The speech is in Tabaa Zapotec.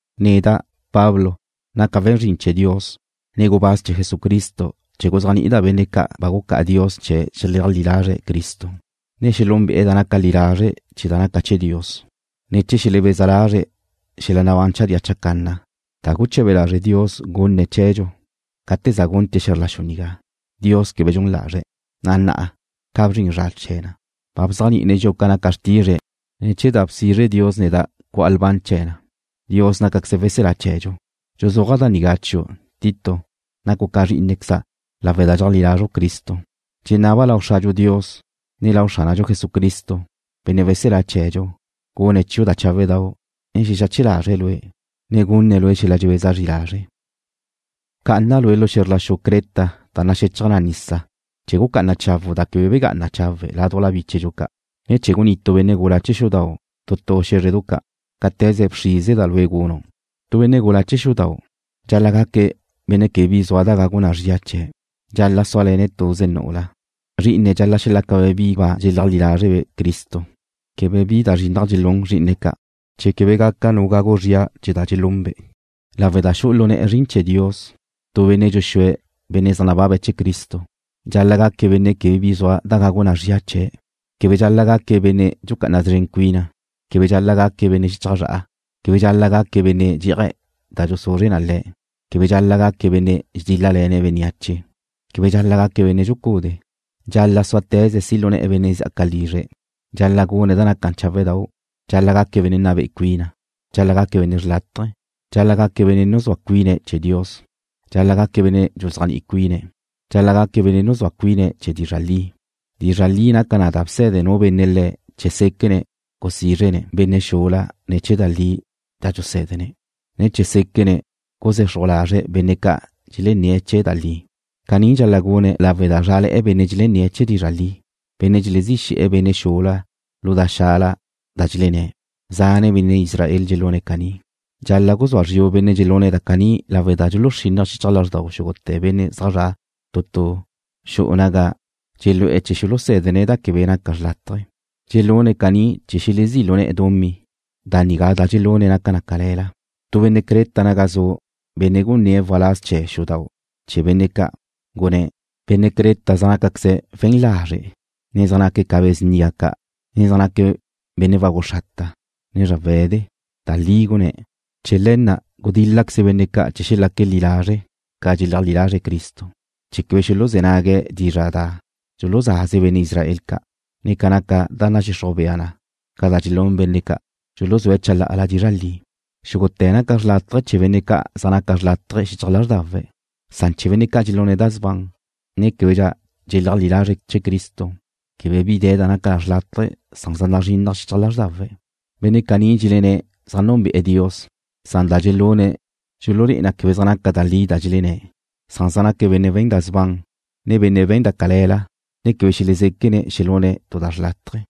Neda', Pablo, naca' we̱n zrin chee̱ Dios, ne gubáz chee̱ Jesucristo chee̱ guzéajni'ida' benne' ca' ba gucá'a Dios chee̱ xeleajlí lazre̱' Cristo, ne xelúnbe'e̱ da naca li lazre' chee̱ da naca chee̱ Dios, ne chee̱ xelebeza lazre̱' xel-la nabán chadía chacanna, da guche̱be lazre' Dios gunne̱' chee̱dxu gate za gunte̱' xe̱zr la xu nigá. Dios quebe dxun lazre̱', na' na'a, ca ba bzrin zra chee̱ na, ba bzéajni'ine̱' dxi'u ca naca xrtizre̱' ne̱ chee̱ da bxrize' Dios neda' cu'a lban chee̱ na. Dios nácaqueze̱' weselá chee̱dxu. Dxuzúaja' da nigá chiu', Tito. Nacu' ca zrí'inequeza' lawe' da dxeajlí lázredxu Cristo. Dxenaba' lau Xradxu Dios, ne lau Xránadxu Jesucristo, Benne' weselá chee̱dxu, gune̱' chiu' da cháwedau', ne xexache lazre̱' lue', ne gunne̱' lue' xel-la dxebeza zri lazre'. Bcá'ana' lue' lu xe̱zr la xu Creta da naxechaj nisa chee̱ gucá'ana chawu' da quebe begá'ana chawe' ládujla bíchedu ca', ne chee̱ gunnitu' benne' gula chee̱ xudau' tu tu xé̱zredu ca', cáte̱ze bxríseda' lue' gunu'. Tu benne' gula chee̱ xudau': Dxal-la' gaque' benne' quebe bi zua da gagu na chie̱'. Dxal-la' súale̱ne̱' tuze nu'ula. Zrí'ine̱' dxal-la' xelácabe' bi ba dxéajlí lázrebe' Cristo. Quebe bi da zrinnaj dxelún zrí'ine̱' ca', ne quebe gaca nu gagu zria chee̱ da dxelunbe'. Lawe' da xu'u lu ne̱'e̱ zrin chee̱ Dios, tu benne' dxuxúe̱' benne' zaj nababe̱' chee̱ Cristo: Dxal-la' gaque̱' benne' quebe bi zua da gagu na zria chee̱'. Quebe dxal-la' gaque̱' benne' dxucá'ana szren cuine̱'. Quebe dxal-la' gaque̱' benne' xichaj zra'a. Quebe dxal-la' gaque̱' benne' dxé'aje̱' da dxuzuzre na le̱'. Quebe dxal-la' gaque̱' benne' dxedíl-lale̱ne̱' bénneache. Quebe dxal-la' gaque̱' benne' dxucúdee̱'. Dxal-la' súate̱ze̱' si' lu ne̱'e̱ benne' zjaque̱' lizre̱'. Dxal-la' gune̱' da naca cháwedau'. Dxal-la' gaque̱' benne' nna be'e cuine̱'. Dxal-la' gaque̱' benne' xrlátaje. Dxal-la' gaque̱' benne' nuzúa cuine̱' chee̱ Dios. Dxal-la' gaque̱' benne' dxuzéajni'i cuine̱'. Dxal-la' gaque̱' benne' nuzúa cuine̱' chee̱ dizra' li. Dizra' li naca na da bse̱de nu benne' le̱' chee̱ séquene̱' gusízrene̱' benne' xubla ne̱ chee̱ da li da dxusé̱dene̱', ne chee̱ séquene̱' guzexruje̱' lazre' benne' ca' dxelenné̱' chee̱ da li na'. Caní dxal-la' gune̱' lawe' da zrále̱'e̱ benne' dxelenné̱' chee̱ dizra' li, benne' dxelezí xe̱'e̱ benne' xubla lu da xala da dxlenné̱'. Zane' benne' Israel dxelune̱' caní. Dxal-la' guzúa zriu' benne' dxelune̱' da caní lawe' da dxuluxrínnaje̱' xichaj lázxdau xúgute̱ benne' zaj zra' tu tu xu'u naga dxelú'e̱ chee̱ xulusé̱dene̱' da quebe naca xrlátaje. Dxelune̱' caní chee̱ xelezí' lu ne̱'e̱ dumí. Da nigá da dxelune̱' naca na da cale̱la. Tu benne' Creta naga zu', benne' gunné̱' waláz chee̱ xudau' chee̱ benne' ca', gunné̱': “Benne' Creta zaj nácaqueze̱' we̱n lazre', ne zaj naque̱' ca be̱ snia ca', ne zaj naque̱' benne' wagu xrata', ne zrawe̱de.” Da li gunné̱'. Chee̱ le̱ na' gudíl-laqueze benne' ca' chee̱ xelaque̱' li lazre' ca dxeleajlí lazre̱' Cristo, ne chee̱ quebe xuluzé̱ nague̱' dizra' da dxuluzaze benne' Israel ca', ne ca naca da nadxixruj bea ca' da dxelún benne' ca' dxuluzúe̱' chalá'ala dizra' li. Xúgute̱ naca na xrlátaje chee̱ benne' ca' zaj naca xrlátaje xichaj lázrdawe̱', san chee̱ benne' ca' dxelune̱' da sban, ne québedxa dxeléajle̱'e̱ chee̱ Cristo, quebe bi de̱ da naca xrlátaje. Zaj nazrinnaj xichaj lázrdawe̱'. Benne' caní dxelenné̱' zaj núnbe'ene̱' Dios, san da dxelune̱' dxulé'e na quebe naca da li da dxelenné̱'. Zaj naque̱' benne' we̱n da sban, ne benne' we̱n da cale̱la, ne quebe xelezéquene̱' xelune̱' tu da xrlátaje.